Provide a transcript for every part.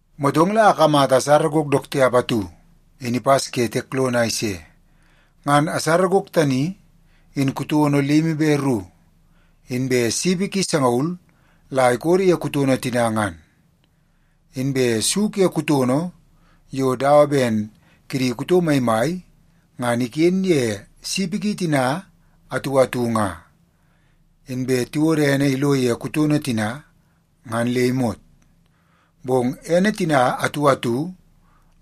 Motong la akamata asara gok dook tiap atu in ipas ke tiek lono a ise. Ngan asara gok tani in kutono limi be ru, inbe sipi ki sangaul la ikodo ye kutono tina ngan. Inbe su ke kutono yo dawa ben kidi kuto maimai ngan iken ye sipi ki tina atu atu nga. Inbe tiwodo ene ilo ye kutono tina ngan le imot, bong ene tina atu atu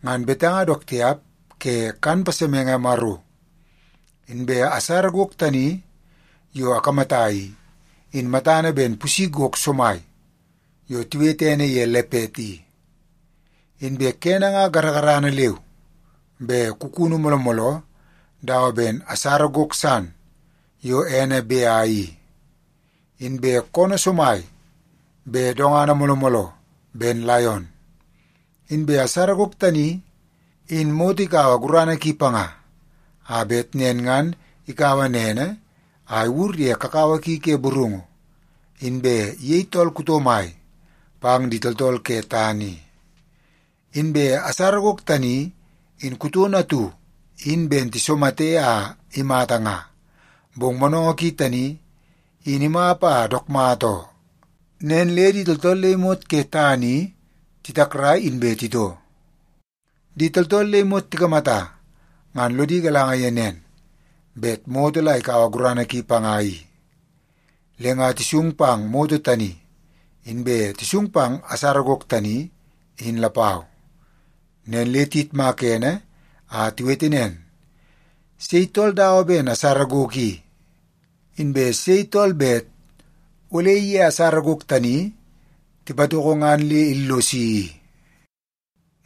ngan betanga dook tiap ke kan pasemenge Maro. Inbe asara gok tani yo akamata i, in matana ben pusi gok somai yo tiwete ene ye lepet i. Inbe kene nga garagarana leu be kukunu mooloo mooloo dawa ben asara gok san yo ene bea i. Inbe koonoo somai be dongana mooloo mooloo ben laion. Inbe asara gok tani, in moto ikaua gurana ki panga, a bet nen ngan ikaua nene a iwur ye kakawa ki ke burungu, inbe iyei tool kuto mai pang di tooltool ke tana i. Inbe asara gok tani in kutono atu in ben tisomate a imata nga, bong monongo ki tani in imap a dook mata oo. Nen le di tooltool le imot ke tana i titakrai inbe titoo. Di tooltool le imot tikamata ngan lodi galanga ye nen, bet moto la ikaua gurana ki panga i. Le nga tisung pang moto tani, inbe tisung pang asara gok tani in lapau. Nen le tiyitmaka ene a tiwete nen, “Sei tool dawa ben asara gok i? Inbe sei tool bet ole iye asara gok tani tipatoko ngan le illosi i?”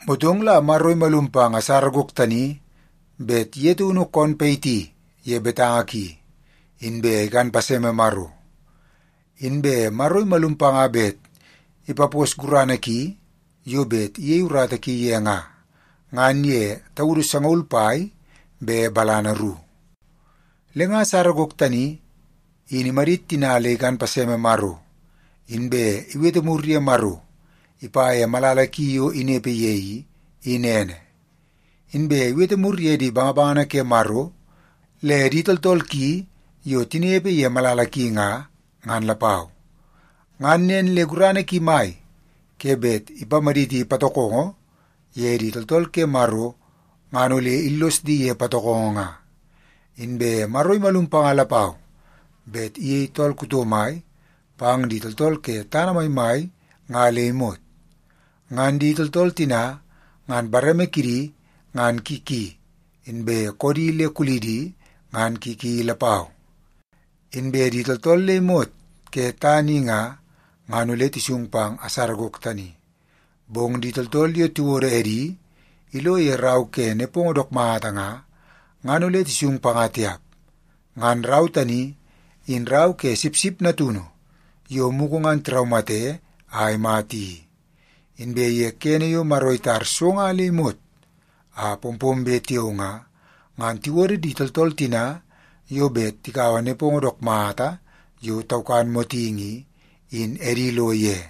Motong la Maro imalum pang asara gok tani bet ye taunu koon payiti ye betanga ki, inbe ikan paseme Maro. Inbe Maro imalum panga bet ipapos gurana ki yo bet iyei urata ki ye nga, ngan ye taudu sangaul pai be balana ru. Le nga asara gok tani in imadit tina le ikan paseme Maro, inbe iwete mur ye Maro ipa ye malala ki yo inepe ye i, in ene. Inbe iwete mur ye di bangabangana ke Maro le di tooltool ki yo tinepe ye malala ki nga, ngan lapau. Ngan nen le gurana ki mai ke bet ipamaditi patokongo ye di tooltool ke Maro ngan ole illos di ye patokongo nga. Inbe Maro imalum panga lapau bet iyei tool kuto mai pang di tooltool ke tana maimai nga le imot. Ngan di tooltool tina ngan bareme kidi ngan ki ki inbe koodi le kulidi ngan ki ki lapau. Inbe di tooltool le imot ke tana i nga, ngan ole tisung pang asara gok tani. Bong di tooltool yo tiwodo edi ilo ye rau ke nepongo dook mata nga, ngan ole tisung panga tiap. Ngan rau tani, in rau ke Sipsip Natunu yo mugu ngan tiraumate a imata i. Inbe ye kene yo Maro itar so nga le imot a pompombe tiao nga, ngan tiwodo di tooltool tina yo bet tikaua nepongo dook mata yo taukan motingi i, in edi ilo ye.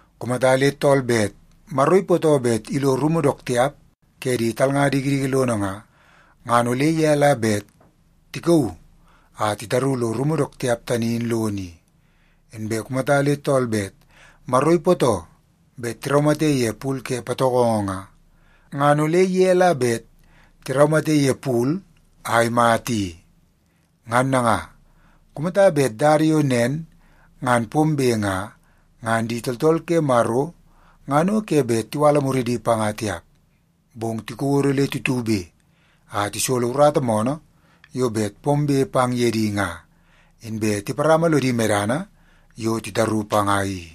Kumata le tool bet Maro ipootoo bet ilo rumu dook tiap ke di talnga dikidiki lono nga, ngan ole ye la bet tikauu a titaru lo rumu dook tiap tani in lono i. Inbe kumata le tool bet Maro ipootoo bet tiraumate ye pul ke patokongo nga, ngan ole ye la bet tiraumate ye pul a imata i. Ngan nanga, kumata bet dada yo nen ngan pombe nga, ngan di tooltool ke Maro ngan o ke bet tiwala muridi panga tiap, bong tikodo le tutube a tisolo urata moonoo yo bet pombe pang ye di nga, inbe tiparama lodi medana yo titaru panga i.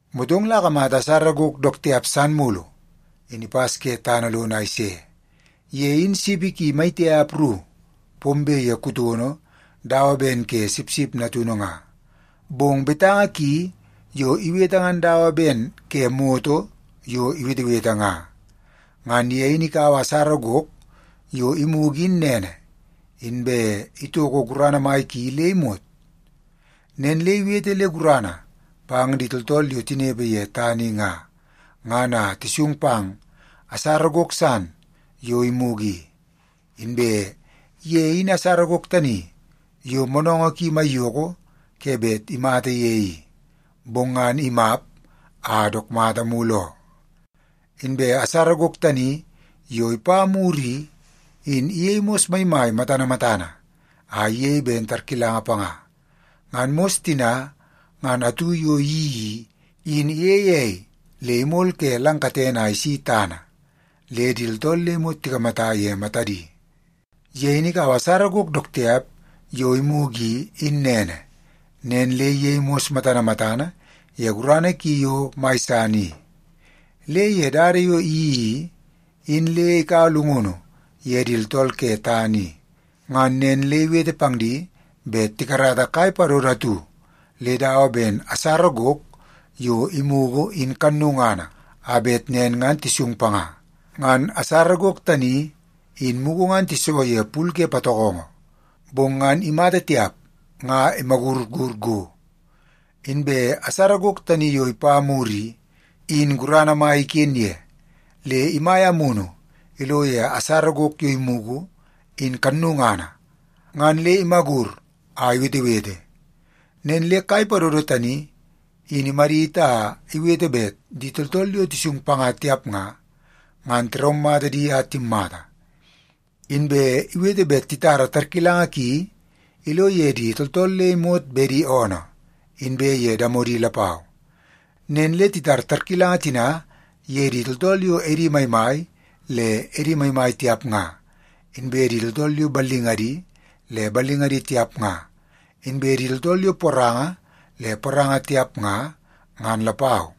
Motong la akamata asara gok dook tiap san mulu, in ipas ke tana lono a ise. Ye in sipi maitiap ru pombe ye kutono dawa ben ke sipsip natunu nga, bong betanga ki yo iwete ngan dawa ben ke moto yo iwetewete nga. Ngan ye in ikaua asara gok yo imugu in nene, inbe itoko gurana mai ki le imot. Nen le iwete le gurana pang di tooltool yo tinepe ye tana i nga, ngan a tisung pang asara gok san yo imugu i. Inbe ye in asara gok tani yo moonoongoo ki maiyoko ke bet imata ye i, bong ngan imap a dook mata mulu oo. Inbe asara gok tani yo ipa mur i, in iyei mos maimai matana matana a iyei ben tarkilanga panga. Ngan mos tina ngan atu yo iyeii i, in iyeie ei le imol ke lang katene a isi tana le di tooltool le imot tikamata ye matadi. Ye in ikaua asara gok dook tiap yo imugu i, in nene, nen le iyei mos matana matana ye gurana ki yo mai san i. Le ye dada yo iyeii i, in le ikaua llungunu ye di tooltool ke tana i. Ngan nen le iwete pang di bet tikarata kai padodo atu le dawa ben asara gok yo imugu in kannungana, a bet nen ngan tisung panga. Ngan asara gok tani, in mugu ngan tiso ye pul ke patokongo, bong ngan imata tiap nga imagurur go. Inbe asara gok tani yo ipa mur i, in gurana mai iken ye, le imaia amunu ilo ye asara gok yo imugu in kannungana ngan le imagur a iwetewete. Nen le kai padodo tani in imadit a iwete bet di tooltool yo tisung panga tiap nga, ngan tiraumata di a timmata. Inbe iwete bet titara tarkilanga ki ilo ye di tooltool le imot bedi oonoo inbe ye damodi lapau. Nen le titar tarkilanga tina ye di tooltool yo edi maimai le edi maimai tiap nga, inbe di tooltool yo ballingadi le ballingadi tiap nga, inbe di tooltool yo poranga le poranga tiap nga, ngan lapau.